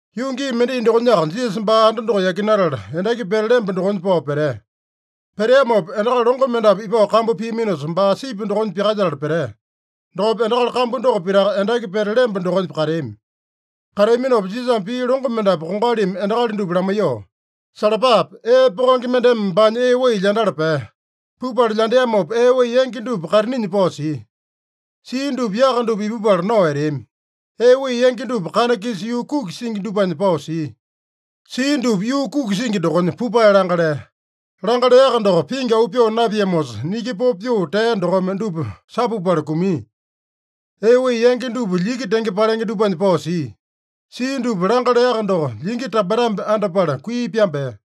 Yuu gii mendai dokonyaka Jisasa baa anda doko yakinatala, endaki pete lemba dokonya pao petea. Peteamopa endakali longo mendapu ipao kambu piaminosa, baa sipi dokonya pyakalyetala petea. Dokopa endakali kambu doko pitaka endaki pete lemba dokonya kateami. Kateaminopa Jisasame pii longo mendapu kongalimi endakali dupa lamaiyoo, “Salapape! Ee pokenge mendeme baanya ee wai lyandala pea. Pupala lyandeamopa ee wai yangi dupa kaitininya pao sia. Sia dupa yaka dupa ipupala nao eteami. Ee wai yangi dupa kana-kisa yuu kuki singi dupanya pao sia. Sia dupa yuu kuki singi dokonya, pupae langa lea. Langa leaka doko, pingi auu pyoo napiamosa, niki popo pyoo tea dokome dupa sapupala kumia. Ee wai yangi dupa lyiki tenge palenge dupanya pao sia. Sia dupa langa leaka doko, lyiki tambetambe andapala kui pyambea.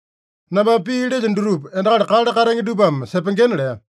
Nambame pii lelyo dutupa endakali kale katenge dupame sepengena” lea.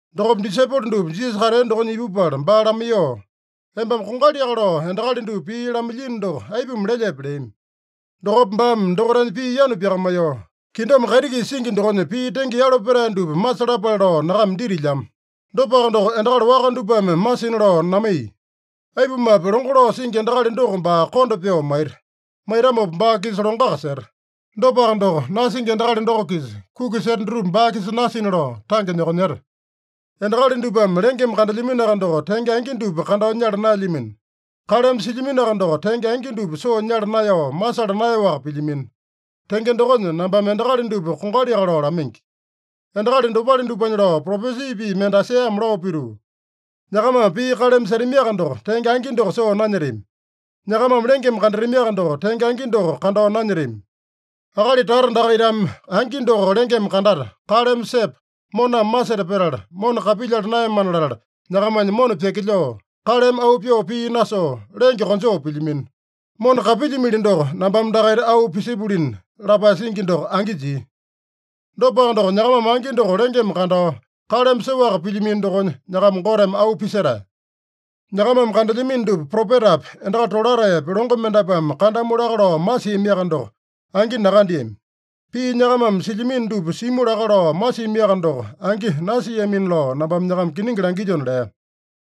Dokopa disaipolo dupa Jisasa katea dokonya ipupala baa lamaiyoo, “Embame kongaliaka lao endakali dupa pii lamailyino doko, aipuma lelyepe?” leami. Dokopa baame dokaitanya pii yanu pyakamaiyoo, “Kingdom kaiti-kisa singi dokonya pii tenge yalo petae dupa masalapale lao nyakama ditilyamo. Dopaka doko, endakali waka dupame masina lao namaiya. Aipumape, longo lao singi endakali doko baa konda pyoo maita. Maitamopa baa-kisa longoaka seta. Dopaka doko, nasingi endakali doko-kisa kuki seta dutupa baa-kisa nasina lao tange nyokonyeta. Endakali dupame lengeme kandelyaminoaka doko, tenge angi dupa kandao nyala naelyamino. Kaleme silyaminoaka doko, tenge angi dupa soo nyala naeyao, masala naeyaowaka pilyamino. Tenge dokonya, nambame endakali dupa kongaliaka lao lamaingi. Endakali dopale dupanya lao propesi pii mende Aisaiyame lao pituu, ‘Nyakamame pii kaleme setamiaka doko, tenge angi doko soo nanyetami. Nyakamame lengeme kandatamiaka doko, tenge angi doko kandao nanyetami. Akali tata dakaitame angi doko lengeme kandata, kaleme sepa, moname maseta petala, mona kapilyala naeyamana latala, nyakamanya mona pyakilyoo, kaleme auu pyoo pii nasoo, lenge konjoo pilyamino. Mona kapilyimili doko, nambame dakaita auu pisipulina’ lapae singi doko angi jia. Dopaka doko, nyakamame angi doko lengeme kandao, kaleme soaka pilyamino dokonya, nyakama Goteme auu pisetae. Nyakamame kandelyamino dupa, propetapi, endakali tolataepi, longo mendapuame kandamu laka lao masiamiaka doko, angi nakandeami. Pii nyakamame silyamino dupa simu laka lao masiamiaka doko, angi nasiamina lao nambame nyakama kiningi langilyona” lea.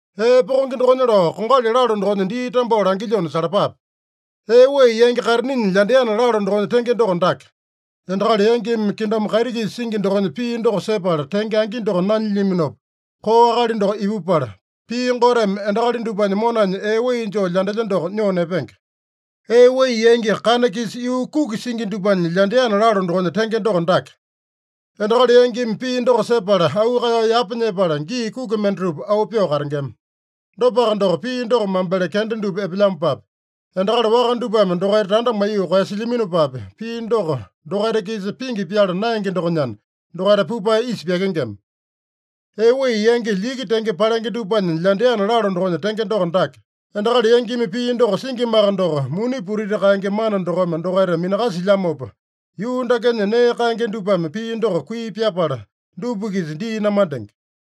“Ee pokenge dokonya lao kongali lalo dokonya dii tambao langilyona salapape: Ee wai yangi kaitininya lyandeana lalo dokonya tenge doko dake: Endakali yangimi kingdom kaiti-kisa singi dokonya pii doko sepala tenge angi doko nanyilyaminopa, koo akali doko ipupala, pii Goteme endakali dupanya monanya ee wai joo lyandelya doko nyoo nepenge. Ee wai yangi kana-kisa yuu kuki singi dupanya lyandeana lalo dokonya tenge doko dake: Endakali yangimi pii doko sepala, auu kaeyao yapa nyepala, gii kuki mendatupa auu pyoo katengema. Dopaka doko, pii doko mambele kenda dupa epelyamopapi, endakali waka dupame dokaita tanda maiyoo koeyasilyaminopapi, pii doko dokaita-kisa pingi pyala naenge dokonyana, dokaita pupae isa pyakengema. Ee wai yangi lyiki tenge palenge dupanya lyandeana lalo dokonya tenge doko dake: Endakali yangimi pii doko singimaka doko, muni putiti kaenge mana dokome dokaita minakasilyamopa, yuu dakenya nee kaenge dupame pii doko kui pyapala, dupa-kisa dii namandenge.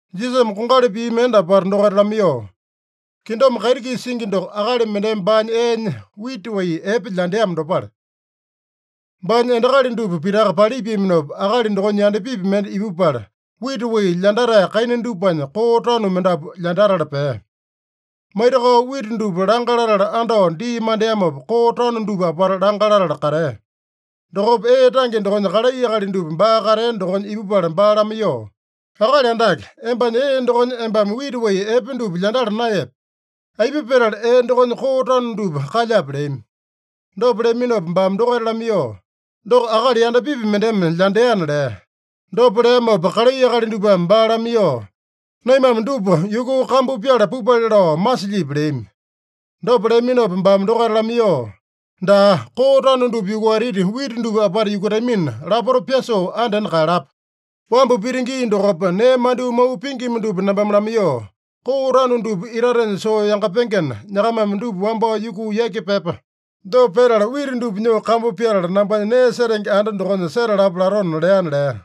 Jisasame kongali pii mende apata dokaita lamaiyoo, “Kingdom kaiti-kisa singi doko, akali mendeme baanya eenya wita wai epe lyandeamo dopale. Baanya endakali dupa pitaka palipiaminopa, akali dokonya yandapipi mende ipupala, wita wai lyandatae kaina dupanya koo tanu mendapu lyandatala pea. Maitakao wita dupa langa latala andao dii mandeamopa, koo tanu dupa apata langa latala katea. Dokopa ee tange dokonya kalai akali dupa baa katea dokonya ipupala baa lamaiyoo, ‘Akali Andake, embanya ee dokonya embame wita wai epe dupa lyandala naeyepe? Aipa petala ee dokonya koo tanu dupa kalyape?’ leami. Dopa leaminopa baame dokaita lamaiyoo, ‘Doko akali yandapipi mendeme lyandeana’ lea. Dopa leamopa kalai akali dupame baa lamaiyoo, ‘Naimame dupa yukuu kambu pyala pupale lao masilyipi?’ leami. Dopa leaminopa baame dokaita lamaiyoo, ‘Daa, koo tanu dupa yukuatiti, wita dupa apata yukutamina, lapota pyasoo andena kaeyalapa. Wambu pita gii dokopa, nee mandyoo mau pingima dupa nambame lamaiyoo, “Koo tanu dupa itatenya soo yangapengena, nyakamame dupa wambao yukuu yaki pyepa. Dopa petala wita dupa nyoo kambu pyatala, nambanya nee setenge anda dokonya setalapa” latona’ leana” lea.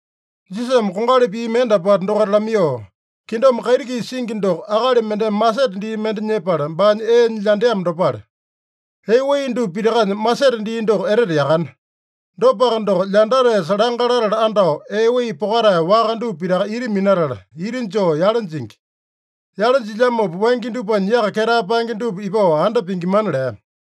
Jisasame kongali pii mende apata dokaita lamaiyoo, “Kingdom kaiti-kisa singi doko, akali mendeme masete dii mende nyepala, baanya eenya lyandeamo dopale. Ee wai dupa pitakanya masete dii doko etete yakane. Dopaka doko, lyandataesa langa latala andao, ee wai pokatae waka dupa pitaka ita minatala, ita joo yale jingi. Yale jilyamopa, wangya dupanya yaka ketae paenge dupa ipao anda pingimana” lea.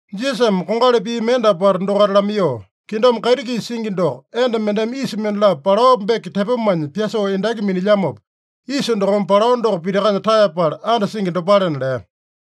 Jisasame kongali pii mende apata dokaita lamaiyoo, “Kingdom kaiti-kisa singi doko, enda mendeme yisa mendalapo palao beke tepomanya pyasoo endaki minilyamopa, yisa dokome palao doko pitakanya taeyapala andasingi dopalena” lea.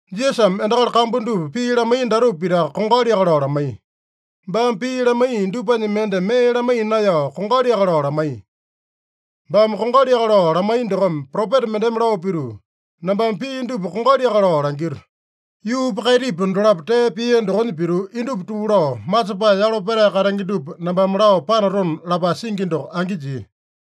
Jisasame endakali kambu dupa pii lamaiya datupa pitaka kongaliaka lao lamaiya. Baame pii lamaiya dupanya mende mee lamaiya naeyao, kongaliaka lao lamaiya. Baame kongaliaka lao lamaiya dokome, propeta mendeme lao pituu, “Nambame pii dupa kongaliaka lao langito. Yuupa kaitipa dolapo tee pia dokonya pituu, indupa tuu lao, masepae yalo petae katenge dupa nambame lao panatona” lapae singi doko angi jia.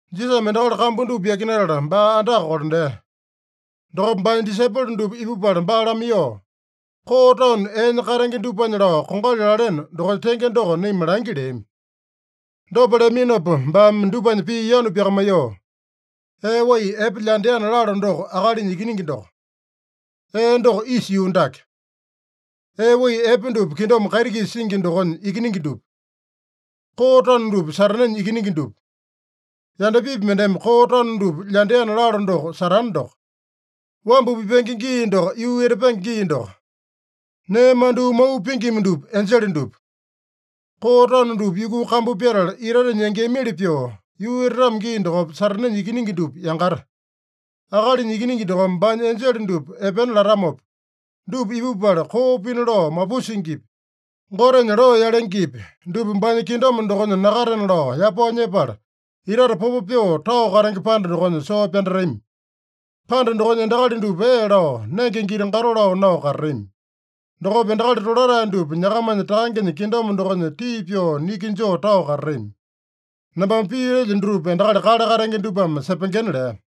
Jisasame endakali kambu dupa yakinatala, baa andaka kolandea. Dokopa baanya disaipolo dupa ipupala baa lamaiyoo, “Koo tanu eenya katenge dupanya lao kongali laleno dokonya tenge doko naima langi” leami. Dopa leaminopa baame dupanya pii yanu pyakamaiyoo, “Ee wai epe lyandeana lalo doko Akalinya Ikiningi doko. Ee doko isa yuu dake. Ee wai epe dupa kingdom kaiti-kisa singi dokonya ikiningi dupa. Koo tanu dupa Satanenya ikiningi dupa. Yandapipi mendeme koo tanu dupa lyandeana lalo doko Satane doko. Wambu pipenge gii doko yuu etapenge gii doko. Nee mandyoo mau pingima dupa enjele dupa. Koo tanu dupa yukuu kambu pyatala, itatenya yangeamili pyoo, yuu etatamo gii dokopa, Satanenya ikiningi dupa yangata. Akalinya Ikiningi dokome baanya enjele dupa epena latamopa, dupa ipupala, koo pina lao mapusingipi, Gotenya loo yalengepi, dupa baanya kingdom dokonya nakatena lao yapao nyepala, itate popo pyoo tao katenge panda dokonya soo pyandatami. Panda dokonya endakali dupa ee lao, nenge giti-gato lao nao katatami. Dokopa endakali tolatae dupa nyakamanya Takangenya kingdom dokonya tii pyoo niki joo tao katatami. Nambame pii lelyo dutupa endakali kale katenge dupame sepengena” lea.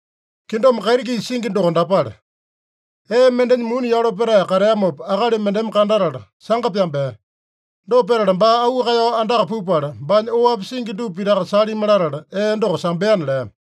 “Kingdom kaiti-kisa singi doko dapale: Ee mendenya muni yalo petae kateamopa akali mendeme kandatala, sanga pyambea. Dopa petala baa auu kaeyao andaka pupala, baanya oapi singi dupa pitaka salimi latala, ee doko sambeana” lea.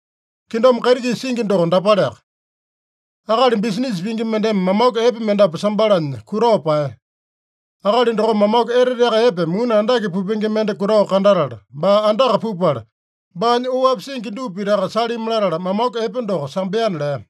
“Kingdom kaiti-kisa singi doko dapaleaka: Akali bisinisa pingi mendeme mamaku epe mendapu sambalanya kutao paeya. Akali dokome mamaku eteteaka epe, muni andake pupenge mende kutao kandatala, baa andaka pupala, baanya oapi singi dupa pitaka salimi latala, mamaku epe doko sambeana” lea.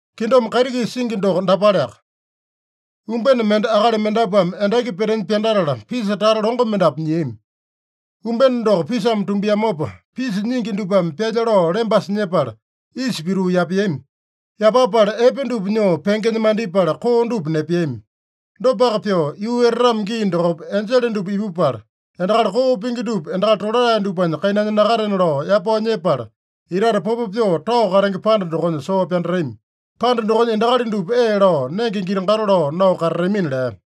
“Kingdom kaiti-kisa singi doko dapaleaka: Umbene mende akali mendapuame endaki petenya pyandatala, pisa tata longo mendapu nyiami. Umbene doko pisame tumbiamopa, pisa nyingi dupame pyalya lao lembasa nyepala, isa pituu yapeami. Yapapala epe dupa nyoo pengenya mandipala, koo dupa nepeami. Dopaka pyoo, yuu etatamo gii dokopa, enjele dupa ipupala, endakali koo pingi dupa endakali tolatae dupanya kainanya nakatena lao yapao nyepala, itate popo pyoo tao katenge panda dokonya soo pyandatami. Panda dokonya endakali dupa ee lao, nenge giti-gato lao nao katatamina” lea.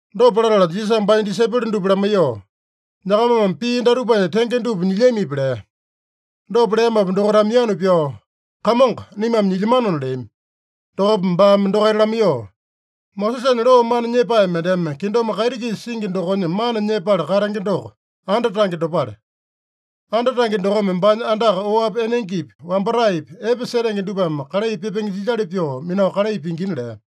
Dopa latala Jisasame baanya disaipolo dupa lamaiyoo, “Nyakamame pii datupanya tenge dupa nyilyamipi?” lea. Dopa leamopa dokaitame yanu pyao, “Kamongo, naimame nyilyamanona” leami. Dokopa baame dokaita lamaiyoo, “Mosesanya loo mana nyepae mendeme kingdom kaiti-kisa singi dokonya mana nyepala katenge doko, anda tange dopale. Anda tange dokome baanya andaka oapi enengepi, wambataepi, epe setenge dupame kalai pipenge jilyali pyoo minao kalai pingina” lea.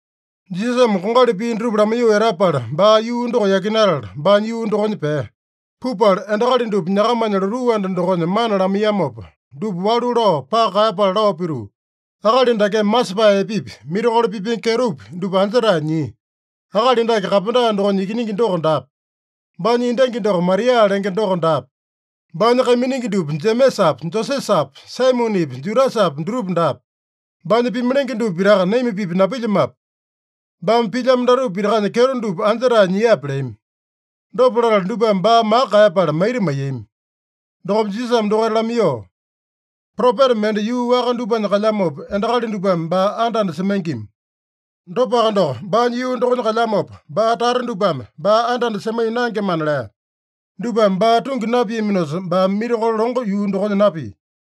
Jisasame kongali pii dutupa lamaiyoo etapala, baa yuu doko yakinatala, baanya yuu dokonya pea. Pupala endakali dupa nyakamanya lotuu anda dokonya mana lamaiyamopa, dupa walu lao paka kaeyapala lao pituu, “Akali dakeme masepae epepi, mirakolo pipenge kyetopi dupa anja-tae nyia? Akali dake kapenda dokonya ikiningi doko daape? Baanya endangi doko Maria lenge doko daape? Baanya kaiminingi dupa Jemesapi, Josesapi, Saimonepi, Judasapi dutupa daape? Baanya pimalenge dupa pitaka naima-pipa napilyamape? Baame pilyamo datupa pitakanya kyeto doko anja-tae nyiape?” leami. Dopa latala dupame baa maka kaeyapala maita maiyami. Dokopa Jisasame dokaita lamaiyoo, “Propeta mende yuu waka dupanya kalyamopa, endakali dupame baa anda-anda semaingima. Dopaka doko, baanya yuu dokonya kalyamopa, baa tata dupame baa anda-anda semaiya naengemana” lea. Dupame baa tungi napiaminosa, baame mirakolo longo yuu dokonya napia.